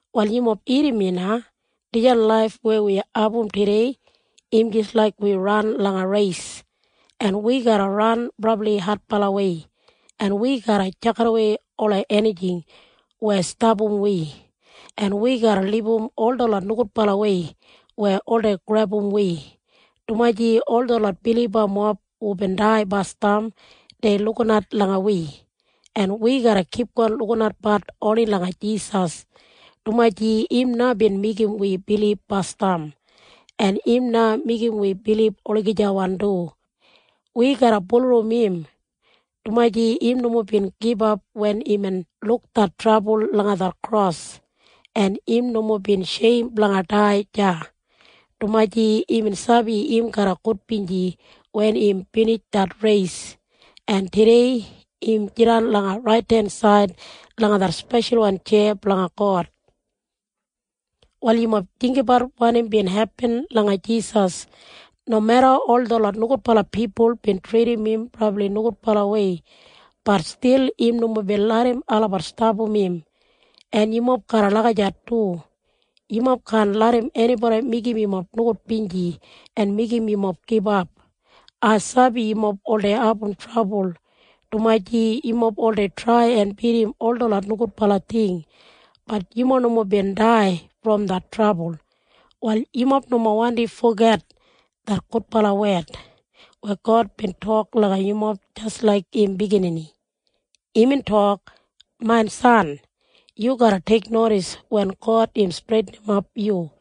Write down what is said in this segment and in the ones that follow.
Wal yumob irrim na. Dijan laif weya wi abum tudei im jis laik wi ran langa reis, en wi garra ran brabli adbalawei, en wi garra tjakidawei ola enijing weya stapam wi, en wi garra libum ol detlot nogudbalawei weya oldei grebum wi, dumaji ol detlot bilibamob hubin dai basdam dei lukinat langa wi, en wi garra kipgon lukinatbat oni langa Jisas, dumaji im na bin meigim wi bilib basdam, en im na meigim wi bilib olagijawan du. Wi garra bulurrum im, dumaji im nomo bin gibap wen imbin luk det trabul langa det kros, en im nomo bin sheim blanga dai deya, dumaji imbin sabi im garra gudbinji wen im binij det reis, en tudei im jidan langa raidensaid langa det speshalwan tjeya blanga God. Wal yumob jinggabat wanim bin hepin langa Jisas. Nomeda ol detlot nogudbala pipul bin tridim im brabli nogudbalawei, bat stil im nomo bin larram olabat stapam im. En yumob garra lagijat du. Yumob kaan larram enibodi meigim yumob nogudbinji en meigim yumob gibap. Ai sabi yumob oldei abum trabul dumaji yumob oldei trai en bidim ol detlot nogudbala ting. Bat yumob nomo bin dai brom det trabul. Wal yumob nomo wandi foget det gudbala wed weya God bin tok langa yumob jis laik im biginini. Imbin tok, “Main biginini, yu garra teiknodis wen God im streitinimap yu,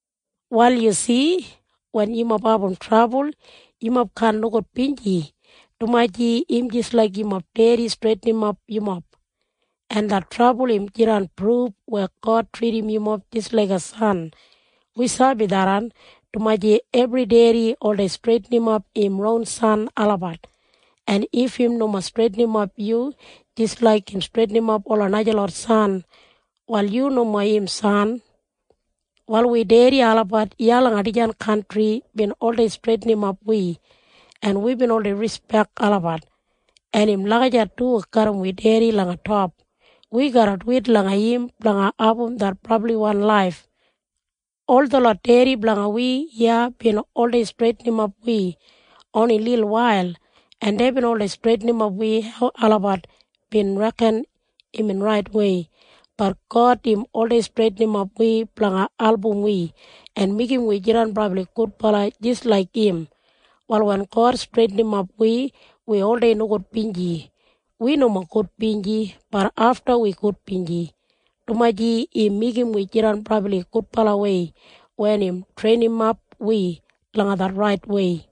Wal yu si? Wen yumob abum trabul, yumob kaan nogudbinji, dumaji im jis laik yumob dedi streitinimap yumob, en det trabul im jidan pruf weya God tridim yumob jis laiga san. Wi sabi tharran, dumaji ebri dedi oldei streitinimap im ron san olabat, en if im nomo streitinimap yu jis laik im streitinimap ola najalot san, wal yu nomo im san. Wal wi dedi olabat iya langa dijan kantri bin oldei streitinimap wi, en wibin oldei rispek olabat, en im lagijat du garram wi dedi langa top. Wi garra duwit langa im blanga abum det brabliwan laif. Ol detlot dedi blanga wi iya bin oldei streitinimap wi oni lilwail, en deibin oldei streitinimap wi hau olabat bin reken imbin raitwei. Bat God im oldei streitinimap wi blanga album wi en meigim wi jidan brabli gudbala jis laik im. Wal wen God streitinimap wi, wi oldei nogudbinji. Wi nomo gudbinji. Bat afta wi gudbinji, dumaji im meigim wi jidan brabli gudbalawei wen im treinimap wi langa det raitwei.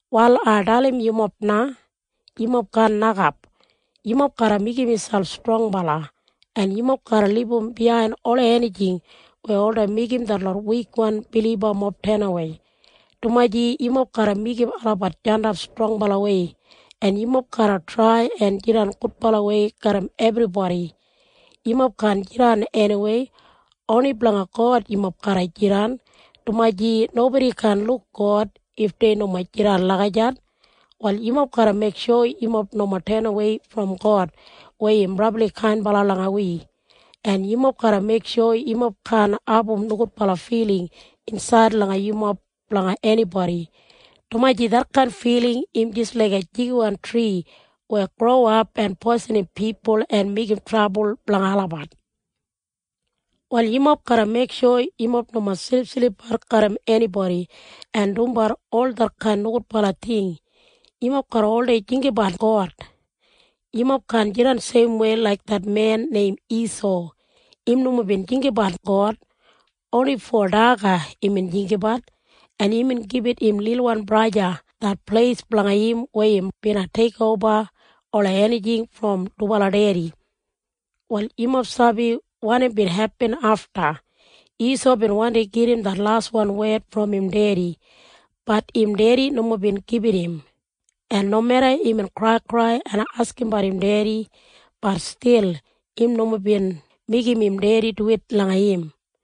Wal ai dalim yumob na. Yumob kaan nokap. Yumob garra meigim miselp strongbala, en yumob garra libum biyain ola enijing weya oldei meigim detlot wikwan bilibamob tenawei, dumaji yumob garra meigim olabat jandap strongbalawei. En yumob garra trai en jidan gudbalawei garram ebribodi. Yumob kaan jidan eniwei. Oni blanga God yumob garra jidan, dumaji nobodi kaan luk God if dei nomo jidan lagijat. Wal yumob garra meiksho yumob nomo tenawei brom God weya im brabli kainbala langa wi, en yumob garra meiksho yumob kaan abum nogudbala filing insaid langa yumob blanga enibodi, dumaji detkain filing im jis laiga jigiwan tri weya growap en poisinim pipul en meigim trabul blanga olabat. Wal yumob garra meiksho yumob nomo silipsilipbat garram enibodi en dumbat ol detkain nogudbala ting. Yumob garra oldei jinggabat God. Yumob kaan jidan seimwei laik det men neim Isau. Im nomo bin jinggabat God. Oni fo daga imbin jinggabat, en imbin gibit im lilwan braja det pleis blanga im weya im bina teikoba ola enijing brom dubala dedi. Wal yumob sabi wanim bin hepin afta. Isau bin wandi gedim det laswan wed brom im dedi. Bat im dedi nomo bin gibit im, en nomeda imbin kraikrai en askimbat im dedi, bat stil im nomo bin meigim im dedi duwit langa im.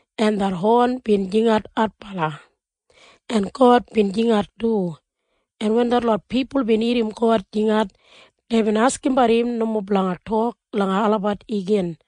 en det hon bin jingat adbala, en God bin jingat du, en wen detlot pipul bin irrim God jingat, deibin askimbat im nomo blanga tok langa olabat igin.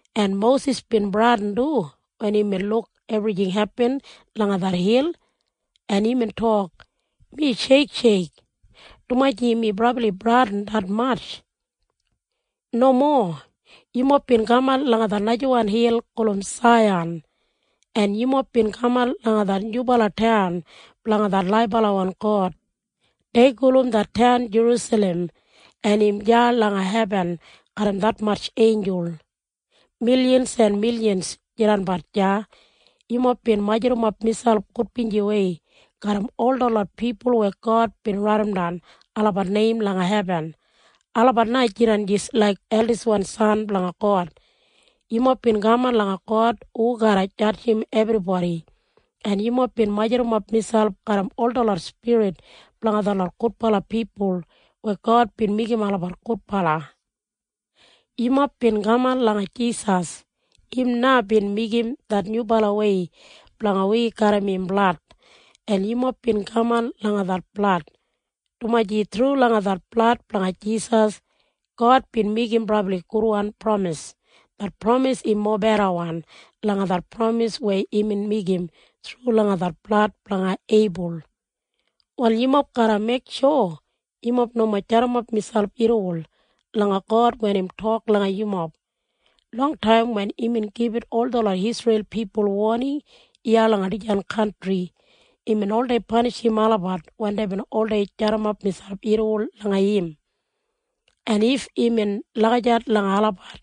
En Mosis bin bradin du wen imbin luk ebrijing hepin langa det hil, en imbin tok, “Mi sheiksheik, dumaji mi brabli bradin detmatj.” Nomo. Yumob bin kaman langa det najawan hil gulum Saiyan, en yumob bin kaman langa det nyubala taun blanga det laibalawan God. Dei gulum det taun Jerusalem, en im deya langa hebin garram detmatj einjul. Milyans en milyans jidanbat deya. Yumob bin majurrumap miselp gudbinjiwei garram ol detlot pipul weya God bin raidimdan olabat neim langa hebin. Olabat na jidan jis laik eldiswan san blanga God. Yumob bin kaman langa God hu garra jadjim ebribodi, en yumob bin majurrumap miselp garram ol detlot spirit blanga detlot gudbala pipul weya God bin meigim olabat gudbala. Yumob bin kaman langa Jisas. Im na bin meigim det nyubalawei blanga wi garram im blad, en yumob bin kaman langa det blad, dumaji thru langa det blad blanga Jisas, God bin meigim brabli gudwan pramis. Det pramis im mobedawan langa det pramis weya imbin meigim thru langa det blad blanga Eibul. Wal yumob garra meiksho yumob nomo jadimap miselp irriwol langa God wen im tok langa yumob. Longtaim wen imbin gibit ol detlot Isreil pipul woning iya langa dijan kantri, imbin oldei panishim olabat wen deibin oldei jadimap miselp irriwol langa im. En if imbin lagijat langa olabat,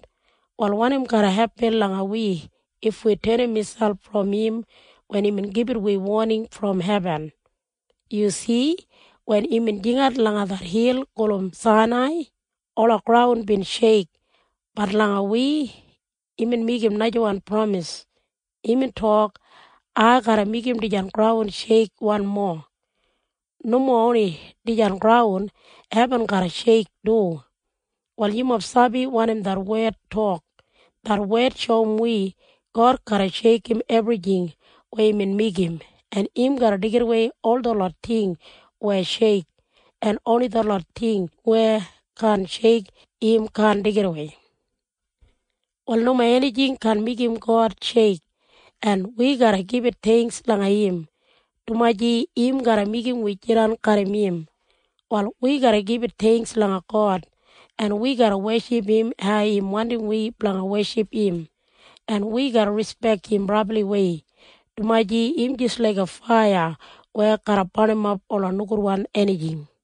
wal wanim garra hepin langa wi if wi tenim miselp brom im wen imbin gibit wi woning brom hebin? Yu si? Wen imbin jingat langa det hil gulum Sainai, ola graun bin sheik. Bat langa wi imbin meigim najawan pramis. Imbin tok, “Ai garra meigim dijan graun sheik wanmo. Nomo oni dijan graun, hebin garra sheik du.” Wal yumob sabi wanim det wed tok? Det wed shoum wi God garra sheikim ebrijing weya imbin meigim, en im garra deigidawei ol detlot ting weya sheik, en oni detlot ting weya kaan sheik im kaan deigidawei. Wal nomo enijing kaan meigim God sheik, en wi garra gibit theingks langa im, dumaji im garra meigim wi jidan garram im. Wal wi garra gibit theingks langa God, en wi garra weship im hau im wandim wi blanga weship im, en wi garra rispek im brabliwei, dumaji im jis laiga faiya weya garra barnimap ola nogudwan enijing.